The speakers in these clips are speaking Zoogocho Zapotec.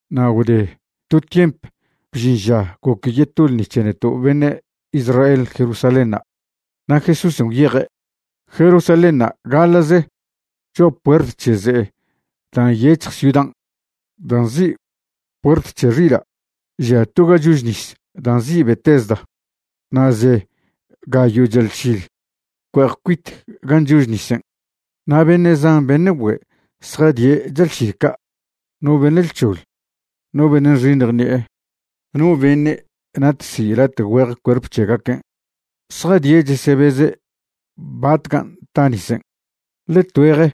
Na' gwde to tiemp bžin ža goc yeto ḻṉi c̱he neto' beṉe' Israel Jerusalénṉa', na' Jesúsen' gwyeje'. Jerusalénṉa' gaḻa'ze cho'a puert c̱he ze'e da' nyec̱hj ciudan' dan' nzi' Puert c̱he Xila' žia to ga chož nis da' nzi' Betesda, na' ze gayo' chalšil cue'ej cuite gan' chož nisen'. Na' beṉe' zan beṉe' güe' zjadie' chalšil ca', no beṉe' lc̱hoḻ, no beṉe' nxiṉj ṉi'e, no beṉe' natsi' late' güeje cuerp c̱hegaquen'. Zjadie' chesebeze' batcan' ta nisen'. Ḻe tgüeje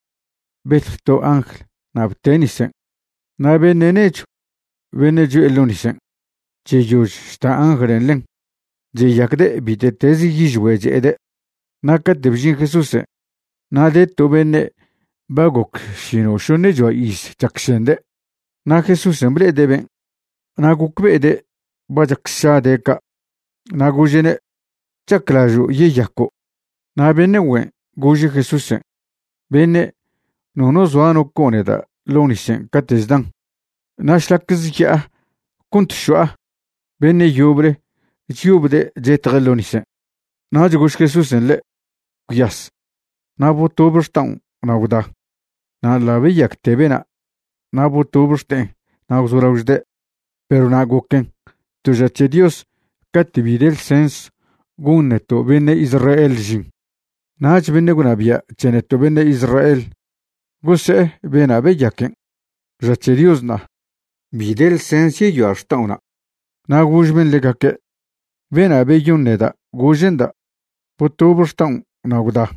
betj to angl na' bte' nisen', na' beṉe' nechw beṉe' cho'e ḻo' nisen' cheyož chta anglen' ḻen, cheyacde' bite'tez yižgüe' che'ede'. Na' cate' bžin Jesúsen' na' de to beṉe' ba goc šino'šoṉechoa iz chacšende'. Na' Jesúsen' ble'ede' ben' na' gocbe'ede' ba chac sša de' ca', na' gože'ne': ―¿Chaclažo' yeyaco'? Na' beṉe' güen' gože' Jesúsen': ―Beṉe', nono zoa no co' neda' ḻo' nisen' cate' chdan. Na' šlac zya'a cont šo'a, beṉe' yoble chyobde' chetje' ḻo' nisen'. Nach gož Jesúsen' ḻe': ―Gwyas na' botobe xta'on na' gwda. Na' ḻa' beyacte bena' na' botob xte'en na' gwzolao chde'. Perw na' goquen to ža c̱he Dios cate' bi de ḻsens gon neto' beṉe' Israel žin. Nach beṉe' gwnabia' c̱he neto' beṉe' Israel gose'e bena' beyaquen': ―Ža c̱he Dios ṉa'a. Bi de ḻsens yeyoa' xta'ona'. Na' gož ben' ḻegaque': ―Bena' beyon neda' gože'nda': “Botobe xtaon' na' gwda.”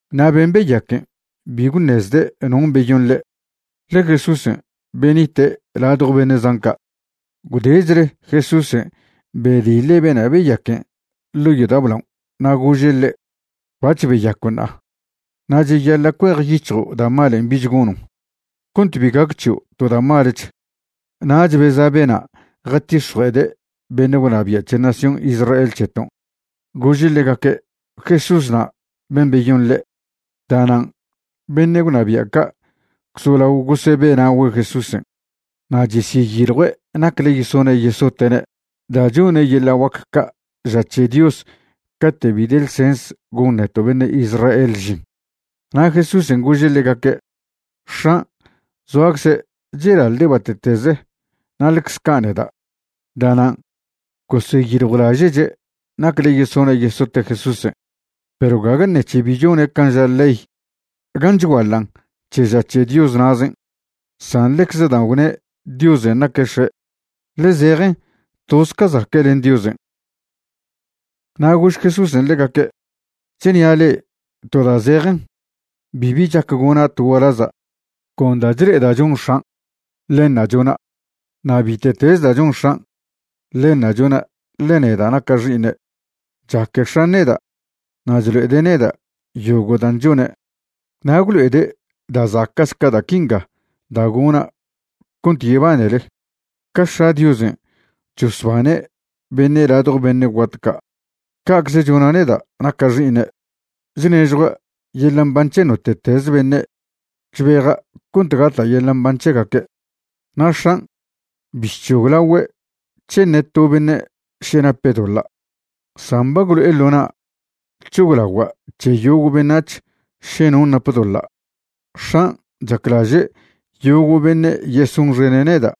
Na' ben' beyaquen' bi gwṉezde' non' beyon ḻe', ḻe Jesúsen' benite' ladjo beṉe' zan ca'. Gwdechle Jesúsen' bediḻe' bena' beyaquen' ḻo' yodao' blaon' na' gože' ḻe': ―Bac̱h beyaco' ṉa'a, na' cheyaḻa' cuejyic̱hjo' da' malen' bich gonon', cont bi gac c̱hio' to da' malech. Nach beza' bena' jatix̱jue'ede' beṉe' gwnabia' c̱he nación Israel c̱heton' gože' ḻegaque' Jesúsna' ben' beyon ḻe'. Da'nan' beṉe' gwnabia' ca' gwzolao gosebe'na'ogüe' Jesúsen' na' cheseyiljue' nacle yesone' yesote'ne' da' chone' yeḻa' guac ca' ža c̱he Dios cate' bi de ḻsens gon neto' beṉe' Israel žin. Na' Jesúsen' gože' ḻegaque': ―X̱an' zoacze' chelaḻde' bate'teze na' ḻecze ca' neda'. Da'nan' goseyiljwlaže'che' nacle yesone' yesote' Jesúsen', perw gague ṉec̱he bi chone' can' ža ley gan' chguaḻan' c̱he ža c̱he Dios na'zen', san ḻecze da' gwne' Diosen' naque' X̱e', ḻe zejen toz ca zaque' len Diosen'. Na' gož Jesúsen' ḻegaque': ―Chnia' le'e to da' zejen, bibi chac gona' to gualaza'. Con da' chle'eda' chon X̱an', ḻenṉa' chona', na' bite'teze da' chon X̱an', ḻenṉa' chona', ḻe neda' naca' Xi'iṉe'. Chaque X̱an' neda' na' chlo'ede' neda' yogo' dan' chone'. Na' gwlo'ede' da' zaca'ch ca da' quinga da' gona' cont yebanele. Ca X̱a' Diosen' chosbane' beṉe' ladjo beṉe' guat ca', ca'cze chona' neda' naca' Xi'iṉe', chnežjua' yeḻa' mban c̱he note'tez beṉe' chbeja' cont gata' yeḻa' mban c̱hegaque'. Na' X̱an' bi chc̱hoglagüe' c̱he ṉe to beṉe' še nape' doḻa', san ba gwlo'e ḻo na' c̱hoglagua' c̱he yogo' beṉac̱h še non' nap doḻa'. X̱an' chaclaže' yogo' beṉe' yesonxene' neda'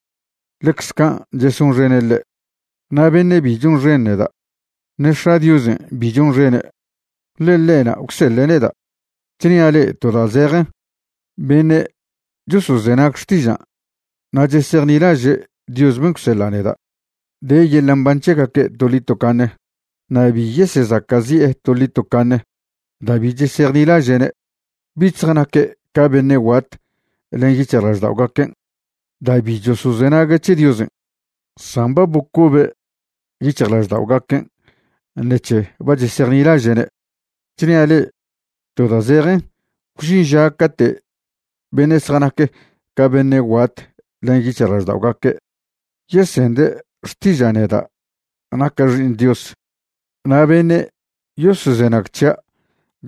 ḻecze can' chesonxene' ḻe'. Na' beṉe' bi chonxen neda', ṉe X̱a' Diosen' bi chonxene', ḻe ḻe'na' gwseḻe' neda'. ’Chnia' le'e to da' zejen, beṉe' chosozenag xtižan' na' chesejnilaže' Dios ben' gwseḻa' neda', de yeḻa' mban c̱hegaque' toḻi tocaṉe. Na' bi yesezaca'zi'e toḻi tocaṉe da' bi chesejnilaže'ne'. Bich zjanaque' ca beṉe' guat len yic̱hjlažda'ogaquen' da' bi chosozenague' c̱he Diosen', san ba bocobe' yic̱hjlažda'ogaquen' ṉec̱he ba chesejnilaže'ne'. Chnia' le'e to da' zejen, gwžin ža cate' beṉe' zjanac ca beṉe' guat len yic̱hjlažda'ogaque' yesende' xtiža' neda' naca' Xi'iṉ Dios, na' beṉe' yosozenag c̱hia'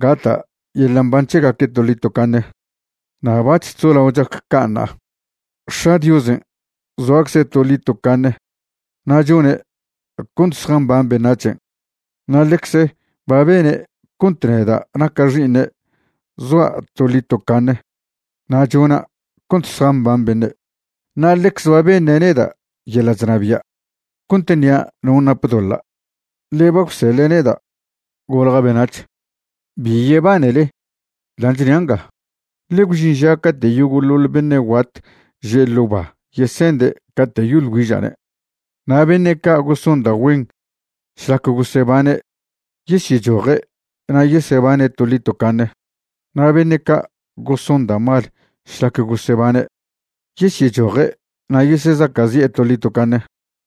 gata' yeḻa' mban c̱hegaque' toḻi tocaṉe, na' bac̱h chzolao chac ca' ṉa'a. X̱a' Diosen' zoacze' toḻi tocaṉe na' chone' cont zjamban beṉac̱hen', na' ḻecze ba bene' cont neda' naca' Xi'iṉe' zoa' toḻi tocaṉe na' chona' cont zjamban beṉe'. Na' ḻecze ba beṉe' neda' yeḻa' chnabia' cont ṉia' non' nap doḻa', ḻe ba gwseḻe' neda' golja' beṉac̱h. Bi yebanele dan' chnia' nga, ḻe gwžin ža cate' yogo'ḻoḻ beṉe' guat že' ḻo' ba yesende' cate' yoḻ güiža'ne'. Na' beṉe' ca' goson da' güen šlac gosebane' yesyechoje' na' yesebane' toḻi tocaṉe. Na' beṉe' ca' goson da' mal šlac gosebane' yesyechoje' na' yesezaca'zi'e toḻi tocaṉe.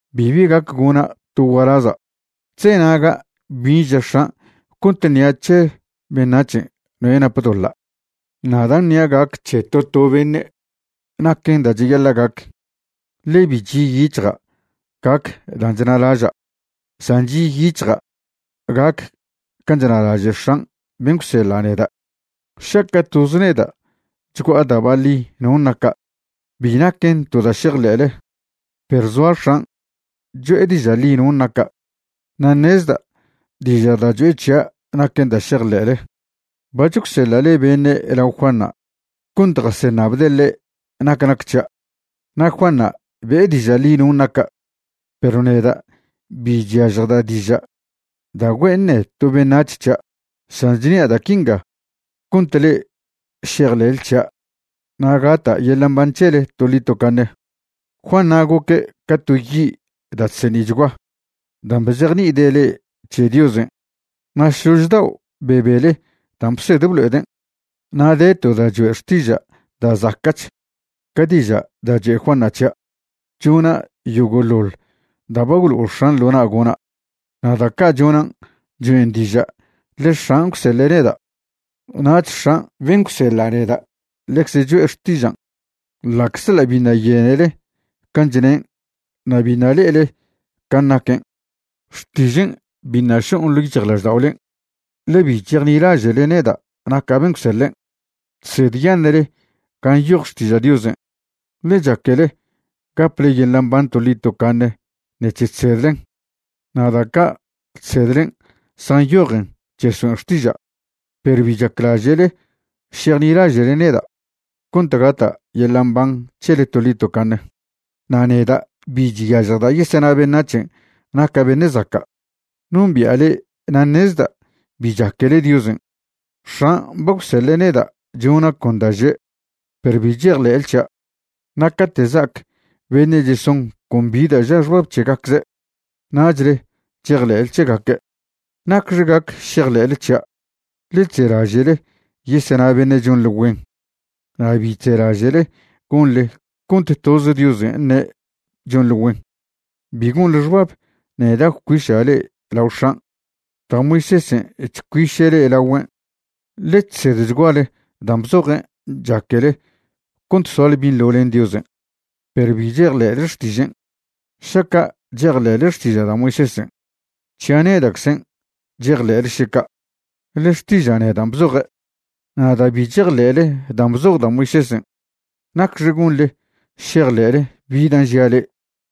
’Bibi gac gona' to gualaza'. Chzenaga' bin' ža X̱an' cont ṉia' c̱he beṉac̱hen' noe' nap doḻa'. Na' dan' ṉia' gac c̱he to to beṉe' naquen da' cheyaḻa' gac, ḻe bi chi'yic̱hja' gac dan' chnalaža'; san chi'yic̱hja' gac can' chnalaže' X̱an' ben' gwseḻa' neda'. Šaca' toz neda' chgua'a da' baḻi non' naca', bi naquen to da' šejḻe'le. Perw zoa X̱an' cho'e diža' ḻi non' naca', na' ṉezda' diža' da' cho'e c̱hia' naquen da' šejḻe'le. Bac̱h gwseḻa'le beṉe' lao Juanṉa' cont jaseṉabde' ḻe' nac nac c̱hia', na' Juanṉa' be'e diža' ḻi non' naca'. Perw neda' bi chyažjda' diža' da' güe' ṉe to beṉac̱h c̱hia'. San chnia' da' quinga cont le'e šejḻe'le c̱hia' na' gata' yeḻa' mban c̱hele toḻi tocaṉe. Juanṉa' goque' ca to yi' da' chseṉi'chgua dan' bzejni'ide' le'e c̱he Diosen', na' šlož daon' bebele dan' bsed blo'eden'. Na' de to da' choe' xtiža' da' zaca'ch ca diža' da' choe' Juanṉa' c̱hia': chona' yogoḻoḻ da' ba gwlo'o X̱an' ḻo na' gona', na' da' ca' chonan' choen' diža' ḻe X̱an' gwseḻe' neda'. Nach X̱an' ben' gwseḻa' neda' ḻecze cho'e xtižan', ḻa'czḻa' biṉa' yenele can' chnen' na' biṉa' le'ele can' naquen'. Xtižen' biṉa' šon' ḻo' yic̱hjlažda'olen', ḻe bi chejnilaže'le neda' naca' ben' gwseḻen'. Chsedyaṉe'le gan' nyoj Xtiža' Diosen', ḻe chaquele gaple yeḻa' mban toḻi tocaṉe ṉec̱he chsedlen. Na' da' ca' chsedlen' zjanyojen chesoen' xtiža'. Perw bi chaclaže'le šejnilaže'le neda' cont gata' yeḻa' mban c̱hele toḻi tocaṉe. ’Na' neda' bi chyažjda' yesena beṉac̱hen' naca' beṉe' zaca'. Nombi'a le'e na' ṉezda' bi chaquele Diosen'. X̱an' ba gwseḻe' neda' chona' con da' že', perw bi chejḻe'le c̱hia'. Na' cate' za'ac beṉe' cheson con bi da' ža xbab c̱hegacze', nachle chejḻe'le c̱hegaque'. ¿Nacxe gac šejḻe'le c̱hia'? ḻe chzelaže'le yesena beṉe' chonḻe güen, na' bi chzelaže'le gonḻe cont toz Diosen' ṉe' chonḻe güen. Bi gonḻe xbab neda' gwcuiša' le'e lao X̱an'. Da' Moisésen' chcuiše' le'e lagüen', ḻe chsedchguale dan' bzojen' chaquele cont soale binḻo len Diosen', perw bi chejḻe'le xtižen'. Šaca' chejḻe'le xtiža' da' Moisésen', c̱hia' neda'czen' chejḻe'le še ca', ḻe xtiža' nedan' bzoje'. Na' da' bi chejḻe'le dan' bzoj da' Moisésen', ¿nacxe gonḻe šejḻe'le bi dan' žia' le'e?